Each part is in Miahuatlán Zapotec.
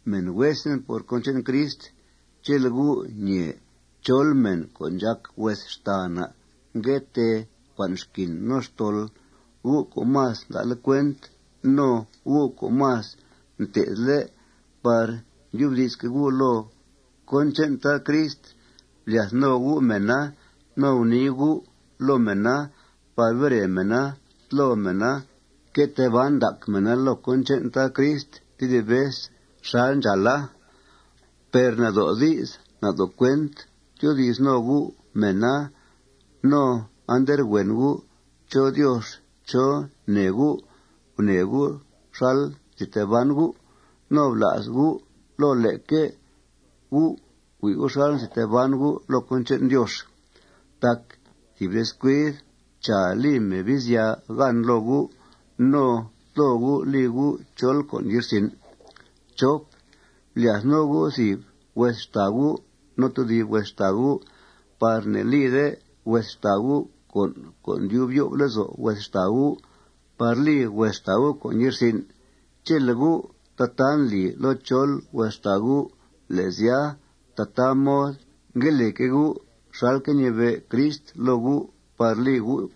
Mèn huesen por cón che'n Crist, chele' gu' ñèe chol mèn co' ndxàc hues xtàa na' ngue tee cua'n xquin no xtol, gu' co' más nda'le' cuent no gu' co' más mté'thle' par ndyubdi'sque' gu' loo cón che'n Tad Crist, blyath no gu' mèna no gunii gu' loo mèna par bere mèna, tlo mèna, que tee ban ndac mèna loo cón che'n Tad Crist tedib vez xal ndxàala. Per nado' di's nado' cuent tyoodi's no gu' mèna. No anderhuen gu' chó Diox chó nee gu' gunee gu' xal nzi tee gu'. No bla's gu' loo leque gu' hui' xal nzi tee ban gu' loo cón che'n Diox. Tac thìb descuid, chàa, li Mebizya gan loo gu' no tlo gu', li gu' chol con' ye'rsin'. Blyath no gu' thìb hues xtàa gu' no tedib hues xtàa gu' par ne'lide hues xtàa gu' con' co' ndyub yo'f lezo' hues xtàa gu' par li hues xtàa gu' con' ye'rsin'. Chele' gu' tataa ndli loo chol hues xtàa gu', le' sya, tataa mod ngue lique' gu' xalque' ñibe' Crist loo gu' par li gu'.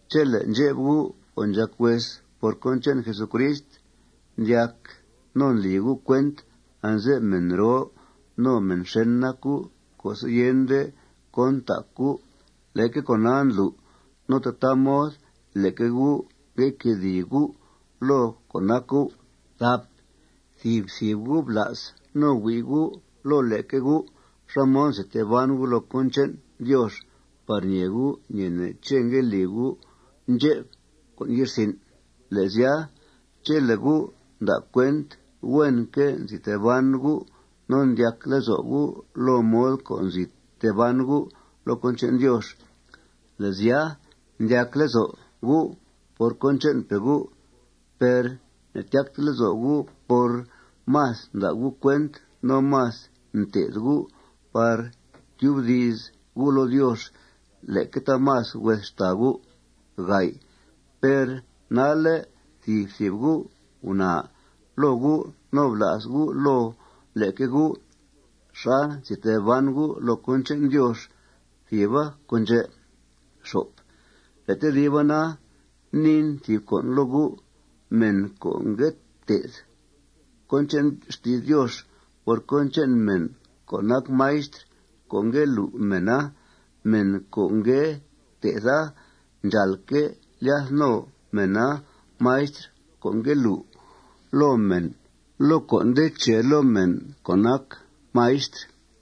Chele' ndxep gu' co' ndxàc hues por cón che'n Jesucrist ndyac no ndli gu' cuent anze'f mèn roo no mèn xèn nac gu' co'se' yende cón ntac gu', leque con'a ndlu' no tataa mod leque gu' ngue quedìi gu' loo con' nac gu'. Thìb thìb gu' bla's no hui' gu' loo leque gu' xá mod nzi tee ban gu' loo cón che'n Diox par ñee gu' ñeene' ché' ngue li gu' ndxep con' ye'rsin'. Le' sya, chele' gu' nda' cuent huenque' nzi tee ban gu' no ndyac lezo' gu' loo mod co' nzi tee ban gu' loo cón che'n Diox, le' sya, ndyac lezo' gu' por cón che'npe' gu'. Per ne'tyacte lezo' gu' por más nda' gu' cuent no más nté'th gu' par tyubdi's gu' loo Diox leque taamas hues xtàa gu'. Per nalle' thìb thìb gu' gunaa loo gu' no bla's gu' loo leque gu' xá nzi tee ban gu' loo cón che'n Diox. Thìba con' ndxè'. Le' tediba na, niin thìb con' loo gu': Mèn co' ngue té'th cón che'n xti's Diox por cón che'n mèn co' nac maistr co' ngue lu' mèna, mèn co' ngue té'tha ndxàalque' lyath no mena maistr co' ngue lu' loo mèn loo con' co' nde che loo mèn co' nac maistr.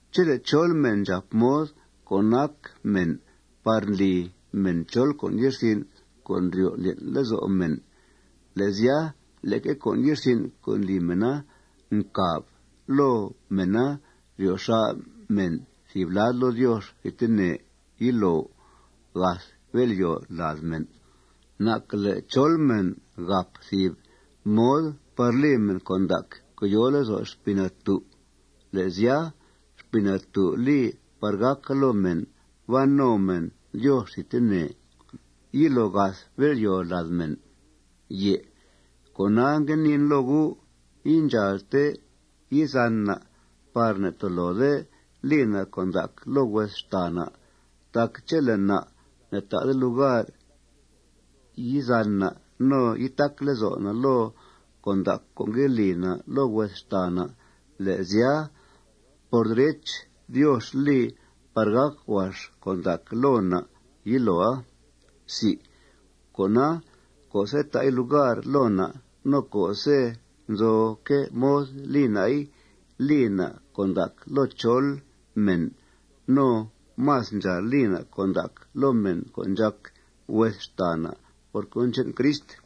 Chele' chol mèn ndxàp mod co' nac mèn par ndli mèn chol con' ye'rsin' co' ndryo' ndlyen' lezo' mèn, le' sya, leque con' ye'rsin' co' ndli mèna ncàba loo mèna ryo xà' mèn thìb lad loo Diox thidtene yilo gath bél'yòo lad mèn. Nacquele' chol mèn gàp thìb mod par li mèn con' ndac co' yòo lezo' Xpii Natú', le' sya, Xpii Natú' li par gàca loo mèn ban no mèn Diox thidtene yilo gath bél'yòo lad mèn. Cona, ngue niin loo gu': Indxàalte yizan na' par ne'tolode li na' con' ndac loo hues xtàa na'. Tac chele' na' ne'ta'de lugar yizan na' no yitac lezo' na' loo con' ndac co' ngue li na' loo hues xtàa na', le' sya, por derech, Diox li par gàc huax con' ndac loo na' yiloa. Cona, co'se' ta'i lugar loo na' no co'se' nzoque' mod li na'i, li na' con' ndac loo chol mèn. No más ndxàal li na' con' ndac loo mèn co' ndxàc hues xtàa na' por cón che'n Crist.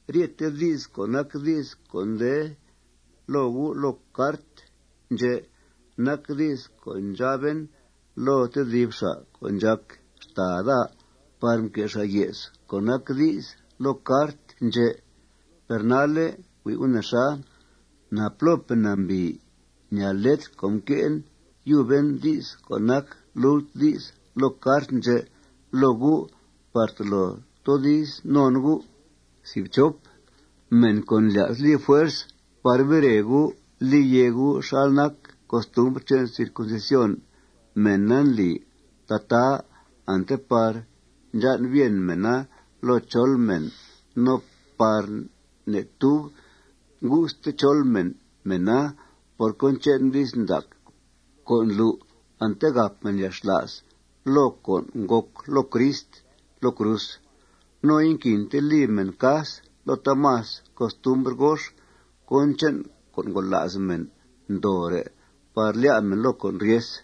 Ryete di's co' nac di's co' nde loo gu' loo cart ndxè' nac di's co' ndxaben loo tedib xa' co' ndxàc xtàa daa par mque' xa' ye's co' nac di's loo cart ndxè'. Per nalle' hui' gu' nexa: Napló nambìi ñaa letr co' mque' yuben di's co' nac lult di's loo cart ndxè' loo gu' par tolo toodiz non gu'. Mèn co' ndlya's li fuerz par bere gu', li yèe gu' xal nac costumbr che'n circuncisión, mèna ndli tataa ante par ndxan' bien mèna loo chol mèn no par ne'tub ngu'ste chol mèn mèna por cón che'n di's ndac co' ndlu' ante gàp mèn yalxla's loo cón ngòc loo Crist loo cruz. No inquinte li mèn cas loo taamas costumbr gox cón che'n con' ngola's mèn ndoore' par lyá' mèn loo con' ryes.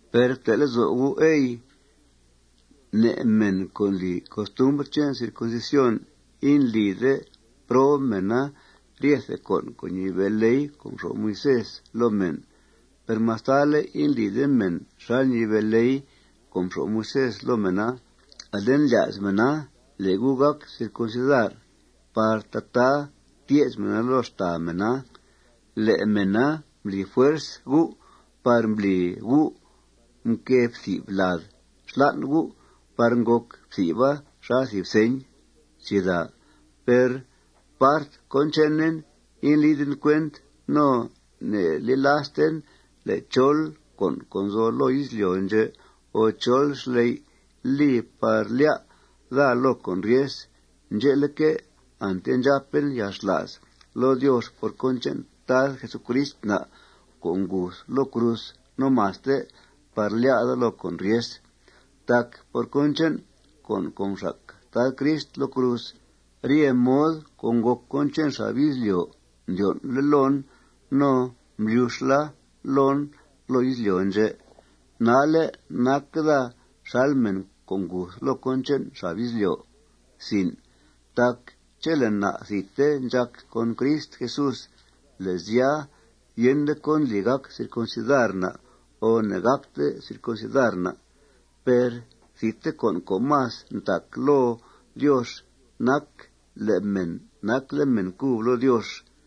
Per fte' lezo' gu', ey, ne' mèn co' ndli costumbr che'n circuncisión, indlide prob mèna ryete con' co' ñibe' ley co' mxo'f Moisés loo mèn. Per mastale' indlide mèn xal ñibe' ley co' mxo'f Moisés loo mèna, ale ndlya's mèna le' gu' gàc circuncidar par tataa tye's mèna loo xtàa mèna le' mèna mbli fuerz gu' par mbli gu' mquée fthi'f lad xlan' gu' par ngòc fthi'fa xal thìb señ. Per part cón chenen, indliden cuent no ne'yilasten le' chol con' co' nzo loo izlyo' ndxè' o chol xley' li par lyá' daa loo con' ryes. Ndxe'leque', ante ndxàpen yalxla's loo Diox por cón che'n Tad Jesucrist na' co' nguth loo cruz no maste par lyá' daa loo con' ryes. Tac por cón che'n con' co' mxac Tad Crist loo cruz, rye mod co' ngòc cón che'n xab izlyo' mdyon'le' loon no mblyuxla loon loo izlyo' ndxè'. Nalle' nac daa xal mèn co' nguth loo cón che'n xab izlyo'. Tac chele' na' thidte ndxàc con Crist Jesús, le' sya, yende cón ndli gàc circuncidar na' o ne'gàcte circuncidar na'. Per thidte con' co' más ntac loo Diox nac le' mèn nacle' mèn cub loo Diox.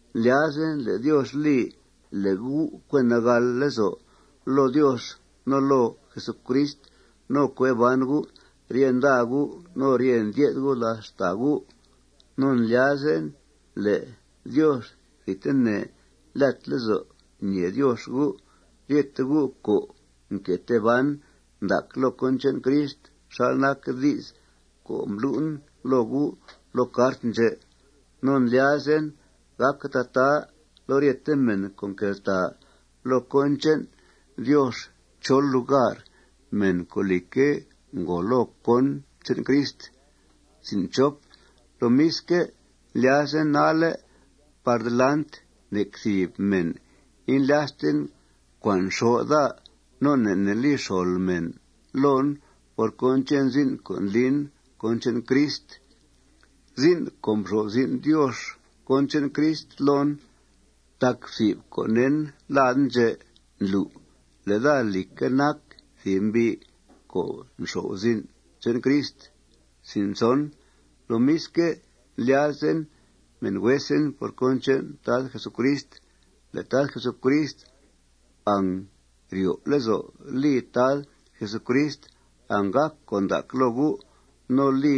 Ndlyazen le' Diox li le' gu' cue nagàl lezo' loo Diox no loo Jesucrist no cue ban gu' rye nda gu' no rye ndye'th gu' làth xtàa gu'. No ndlyazen le' Diox thidtene lyat lezo' ñèe Diox gu', ryete gu' co' nque tee ban ndac loo cón che'n Crist xal nac di's co' mblu'en loo gu' loo cart ndxè'. No ndlyazen gàca tataa loo ryete mèn co' nqueltàa loo cón che'n Diox chol lugar, mèn co', lìcque', ngòo loo cón che'n Crist. Lomisque', ndlyazen nalle' par delant nec thìb mèn indlyasten cua'n xó' daa no ne' ne' li xol mèn loon por cón che'n zin' co' ndlin cón che'n Crist, zin' co' mxo'f zin' Diox cón che'n Crist loon. Tac fthi'f co' ne'en laden ndxè' ndlu' le' daa, lìcque', nac thìb mbi' co' nxo'f zin' che'n Crist. Lomisque' ndlyazen, mèn huesen por cón che'n Tad Jesucrist, le' Tad Jesucrist angryo' lezo' li Tad Jesucrist anggàc con' ndac loo gu', no li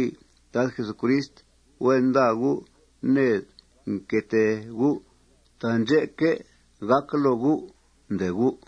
Tad Jesucrist huen nda gu' ned que tee gu'. Taandxè'que' gàca loo gu', ndee gu'.